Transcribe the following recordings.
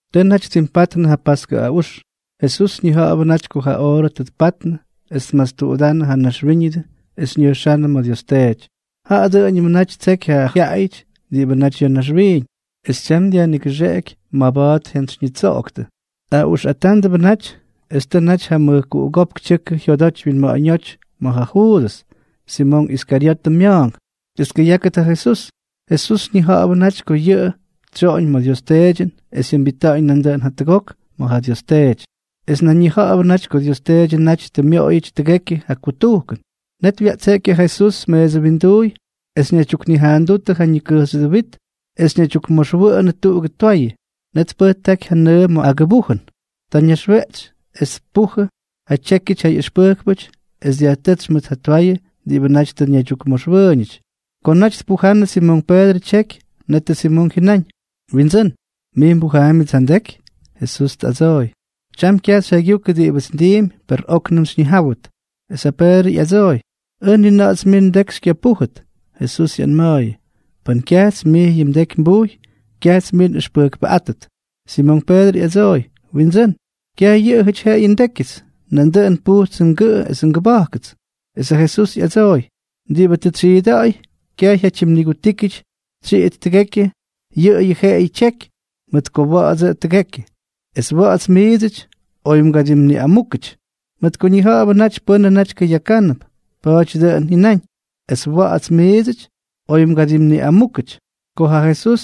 Tʉ naty ttimpatnʉ ja paskʉ aꞌux. Jesús ñija̱ꞌa̱bʉ naty ko ja oorʉ tʉ tpatnʉ es tmastuꞌudánnʉ ja naxwíñʉdʉ es ñʉjxánnʉ ma̱ Dios Teety. Jaꞌa dʉꞌʉñʉmʉ naty ttseky ja jyaꞌayʉty diꞌibʉ naty ya̱ naxwiiñ, es tyam dyajnigʉxeꞌeky maba̱a̱t jyantsytsyoktʉ. Aꞌuxꞌatándʉbʉ naty, es tʉ naty ja mʉjkuꞌugópk tyʉkʉ jyodoty wyinma̱ꞌa̱ñóty ja Juudʉs, Simonk Iskaryotʉ mya̱a̱nk, es tkʉyákʉt ja Jesús. Jesús ñija̱ꞌa̱bʉ naty ko yʉꞌʉ tsyoꞌoñ ma̱ Dios Teedyʉn es jyʉmbita̱ꞌa̱ñ nandʉꞌʉn jatʉgok ma̱ ja Dios Teety, es nan ñija̱ꞌa̱bʉ naty ko Dios Teedyʉ naty tʉ myoꞌoyʉty tʉgekyʉ ja kutujkʉn, net wyaꞌtseꞌky ja Jesús meesʉ winduuy es ñaydyuknijaandútʉ ja ñikʉjxyʉdʉ wit es ñaydyukmoxmʉwʉꞌʉnʉ tuꞌugʉ twayʉ. Net tpʉjtáky ja nʉʉ ma̱ agʉbujʉn. Ta ñaxweꞌtsy es tpujʉ ja tyékyʉty ja ꞌyʉxpʉjkpʉty es dyajtʉ́tsy mʉt ja twayʉ diꞌibʉ naty tʉ ñaydyukmoxwʉʉñʉty. Ko naty tpujannʉ Simonk Peedrʉ tyeky, netʉ Simonk jyʉnáñ: —Windsʉ́n, ¿mij mbujaambyʉts ja ndeky? Jesús tꞌadsooy: —Tyam kyaj xyjaygyukʉ diꞌibʉts ndiimpy, per óknʉm xyñijáwʉt. Es ja Peedrʉ ꞌyadsooy: —¡Ʉj ni na̱ꞌa̱ts mij ndeky xykyapújʉt! Jesús ꞌyanma̱a̱yʉ: —Pʉn kyajts mij yʉ mdeky nbujy, kyajts mij nꞌʉxpʉjkpʉꞌátʉt. Simonk Peedrʉ ꞌyadsooy: —Windsʉ́n, kyaj yʉꞌʉyʉty jeꞌeyʉ ndékyʉts, nandʉꞌʉn pujtsʉ ngʉꞌʉ esʉ ngʉba̱jkʉts. Es ja Jesús ꞌyadsooy: —Diꞌibʉ tʉ tsyiida̱ꞌa̱y, kyaj jyatyimnigutíkyʉty tsyiꞌit tʉgekyʉ, yʉꞌʉyʉ jeꞌeyʉ tyeky, mʉt ko wa̱ꞌa̱dsʉꞌʉ tʉgekyʉ. Es wa̱ꞌa̱ts miidsʉty, oy mgadimniꞌamúkʉty. Mʉt ko ñija̱ꞌa̱bʉ naty pʉ́nʉ naty kʉyakánʉp, pa̱a̱dyʉ dʉꞌʉn jyʉnáñ: “Es wa̱ꞌa̱ts miidsʉty, oy mgadimniꞌamúkʉty.” Ko ja Jesús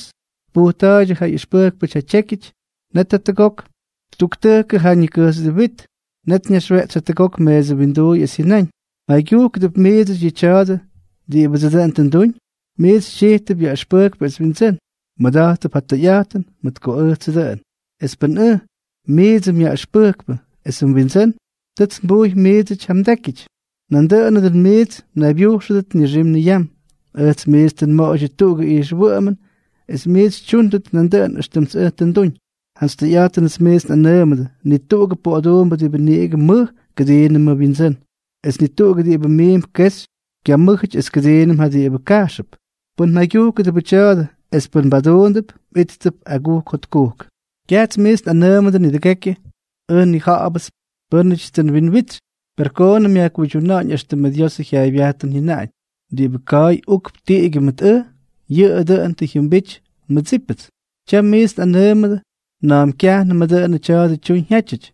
tpujta̱a̱yʉdʉ ja ꞌyʉxpʉjkpʉty ja tyékyʉty, net jatʉgok ttuktʉjkʉ ja ñikʉjxyʉdʉ wit. Net ñaxweꞌtsy jatʉgok meesʉ winduuy es jyʉnáñ: —¿Mjaygyujkʉdʉp miidsʉty yʉ tya̱a̱dʉ diꞌibʉdsʉ dʉꞌʉn tʉ nduñ? Miits xytyijtʉp Yaꞌʉxpʉjkpʉ es Windsʉ́n. Mmʉda̱jttʉp ja tʉyꞌa̱jtʉn, mʉt ko ʉjtsʉ dʉꞌʉn. Es pʉn ʉj, miidsʉ mYaꞌʉxpʉjkpʉ esʉ mWindsʉ́n, tʉts nbujy miidsʉty ja mdékyʉty, nandʉꞌʉnʉ dʉn miits mnaybyujxʉdʉt nixim niyam. Ʉjts miits tʉ nmoꞌoydyʉ tuꞌugʉ ijxwʉꞌʉmʉn es miits xytyúndʉt nandʉꞌʉn éxtʉmts ʉj tʉ nduñ. Jantsy tʉyꞌa̱jtʉnʉts miits nꞌanʉʉmʉdʉ, ni tuꞌugʉ poꞌoduumbʉ diꞌibʉ niꞌigʉ mʉj kʉdiinʉmʉ wyindsʉ́n, es ni tuꞌugʉ diꞌibʉ miimp kexy kyamʉ́jʉty es kʉdiinʉm ja diꞌibʉ kajxʉp. Pʉn mjaygyujkʉdʉbʉ tya̱a̱dʉ es pʉn mbaduundʉp, mꞌíttʉp agujk jotkujk. ’Kyajts miits nꞌanʉʉmʉdʉ nidʉgekyʉ. Ʉj nnija̱ꞌa̱bʉts pʉ́nʉtyts tʉ nwinwitsy. Per koonʉm yajkuydyuna̱ꞌa̱ñ éxtʉmʉ Diosʉ jyaaybyajtʉn jyʉnaꞌañ: “Diꞌibʉ ka̱a̱y ukp tiꞌigyʉ mʉt ʉj, yʉꞌʉ dʉꞌʉn tʉ jyʉmbity nmʉdsípʉts.” Tyam miits nꞌanʉʉmʉdʉ na̱a̱m kyajnʉmʉ dʉꞌʉn tya̱a̱dʉ tyuñ jyátyʉty,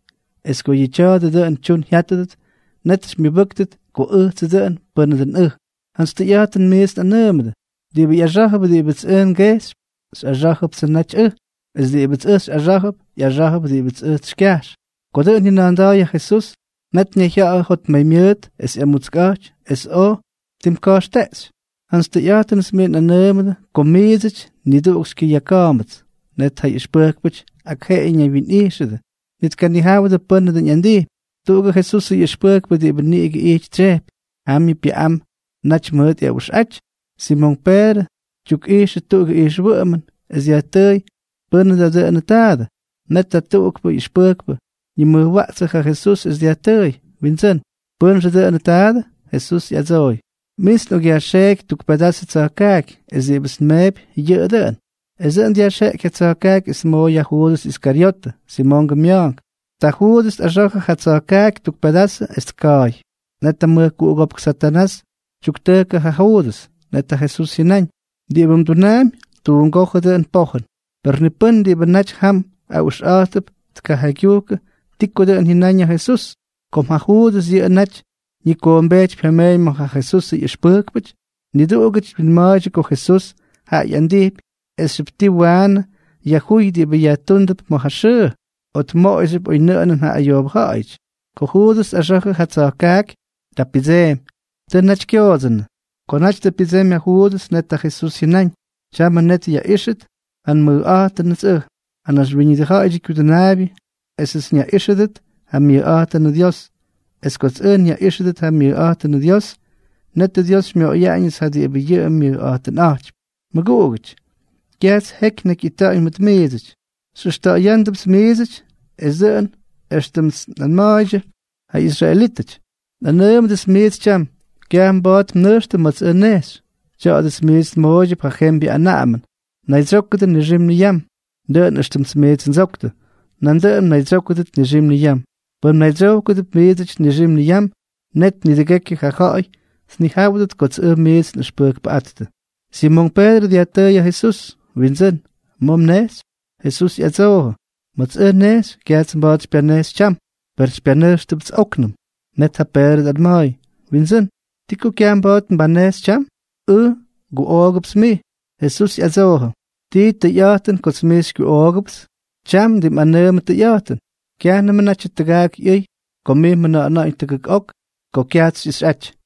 es ko yʉ tya̱a̱dʉ dʉꞌʉn tyun jyátʉdʉt, net xymyʉbʉ́ktʉt ko ʉjtsʉ dʉꞌʉn pʉ́nʉ dʉꞌʉn ʉj. Jantsy tʉyꞌa̱jtʉnʉts miits nꞌanʉʉmʉdʉ, diꞌibʉ ꞌyaxá̱jʉp diꞌibʉts ʉj ngejxypy, xyꞌaxá̱jʉptsʉ naty ʉj, es diꞌibʉts ʉj xyꞌaxá̱jʉp, ꞌyaxá̱jʉp diꞌibʉts ʉj xykyajx. Ko dʉꞌʉn jyʉna̱a̱nda̱a̱y ja Jesús, net ñayjya̱ꞌa̱jʉ jotmaymyʉʉt es ꞌyamutskꞌa̱jty, es oj ttimka̱jxteꞌxy: —Jantsy tʉyꞌa̱jtʉnʉts miits nꞌanʉʉmʉdʉ ko miidsʉty niduꞌuk xykyʉyaka̱a̱mbʉts. Net ja ꞌyʉxpʉjkpʉty ak jeꞌeyʉ ñaywyinꞌíxʉdʉ, ni tkanijáwʉdʉ pʉ́nʉ dʉꞌʉn ꞌyandijpy. Tuꞌugʉ Jesusʉ ꞌyʉxpʉjkpʉ diꞌibʉ niꞌigʉ ijty tsyejpy, jamyʉ pyʉꞌam naty mʉt ꞌyaꞌuxꞌaty. Simonk Peedrʉ tyukꞌijxʉ tuꞌugʉ ijxwʉꞌʉmʉn es dyajtʉʉy pʉ́nʉ dʉꞌʉnʉ taadʉ. Net ja tuꞌukpʉ ꞌyʉxpʉjkpʉ ñimʉjwaꞌtsʉ ja Jesús es dyajtʉʉy: —Windsʉ́n, ¿pʉ́nxʉ dʉꞌʉnʉ taadʉ? Jesús ꞌyadsooy: —Mints nꞌokꞌyajxeeky tuk pedazʉ tsa̱jkaaky, es diꞌibʉts nmeepy, yʉꞌʉ dʉꞌʉn. Es dʉꞌʉn dyajxeꞌky ja tsa̱jkaaky es tmooy ja Juudʉs Iskaryotʉ, Simongʉ mya̱a̱nk. Ta Juudʉs tꞌaxa̱jʉ ja tsa̱jkaaky tuk pedazʉ es tka̱a̱y. Net ja mʉjkuꞌugópk Satanás tyuktʉjkʉ ja Juudʉs. Net ja Jesús jyʉnáñ: —Diꞌibʉ mdunaampy, tuungójʉ dʉꞌʉn pojʉn. Per ni pʉ́n diꞌibʉ naty jam aꞌuxꞌa̱jttʉp tkajaygyujkʉ ti ko dʉꞌʉn jyʉnaꞌañ ja Jesús. Kom ja Juudʉs yʉꞌʉ naty ñikoombejtypy ja meeñ ma̱ ja Jesusʉ ꞌyʉxpʉjkpʉty, niduꞌugʉty twinma̱a̱ydyʉ ko Jesús jaꞌa ꞌyandijpy esxyʉp ti waanʉ yajjúy diꞌibʉ yajtúndʉp ma̱ ja xʉʉ, o tmoꞌoyxyʉp oynʉꞌʉnʉn ja ayoobʉ ja̱ꞌa̱yʉty. Ko Juudʉs tꞌaxa̱jʉ ja tsa̱jkaaky, ta pyʉdseemy. Tʉ naty kyoodsʉnʉ. Ko naty tʉ pyʉdsemy ja Juudʉs, net ja Jesús jyʉnáñ: —Tyamʉ net yaꞌíxʉt ja nmʉjꞌa̱jtʉnʉts ʉj, ja Naxwíñʉdʉ Ja̱ꞌa̱yʉdyʉ Kyudʉnaabyʉ, esʉts nyaꞌíxʉdʉt ja myʉjꞌa̱jtʉnʉ Dios. Es kots ʉj nyaꞌíxʉdʉt ja myʉjꞌa̱jtʉnʉ Dios, netʉ Dios xymyoꞌoyaꞌañʉts ja diꞌibʉ yʉꞌʉ myʉjꞌa̱jtʉnꞌa̱jtypy. Mʉguꞌugʉty, kyajts jeky nnakyꞌita̱ꞌa̱ñ mʉt miidsʉty. Xyꞌʉxta̱ꞌa̱yándʉpts miidsʉty, es dʉꞌʉn éxtʉmts nꞌanma̱a̱ydyʉ ja israelítʉty, nꞌanʉʉmʉdʉts miits tyam: Kyaj mba̱a̱t mnʉjxtʉ ma̱ts ʉj nnejxy. Tya̱a̱dʉts miits nmooydyʉp yʉ jembyʉ anaꞌamʉn: Naydsyókʉdʉ nixim niyam. Dʉꞌʉn éxtʉmts miits ndsoktʉ, nandʉꞌʉn mnaydsyókʉdʉt nixim niyam. Pʉn mnaydsyojkʉdʉp miidsʉty nixim niyam, net nidʉgekyʉ ja ja̱ꞌa̱y tnijáwʉdʉt kots ʉj miits nꞌʉxpʉjkpʉꞌáttʉ. Simonk Peedrʉ dyajtʉʉy ja Jesús: —Windsʉ́n, ¿ma̱ mnejxy? Jesús ꞌyadsoojʉ: —Ma̱ts ʉj nnejxy, kyajts mba̱a̱t xypyanejxy tyam. Per xypyanʉjxʉpts óknʉm. Net ja Peedrʉ tꞌanma̱a̱y: —Windsʉ́n, ¿Ti ko kyaj mba̱a̱t nbanejxy tyam? Ʉj nguꞌoogʉpts mij. Jesús ꞌyadsoojʉ: —¿Tii tʉyꞌa̱jtʉn kots mij xykyuꞌoogʉpts? Tyam ndimꞌanʉʉmʉ tʉyꞌa̱jtʉn, kyajnʉmʉ natyʉ tʉgaak ꞌyʉy ko mij mjʉna̱ꞌa̱na̱ꞌa̱ñ tʉgʉk ok ko kyajts xyꞌixyꞌaty.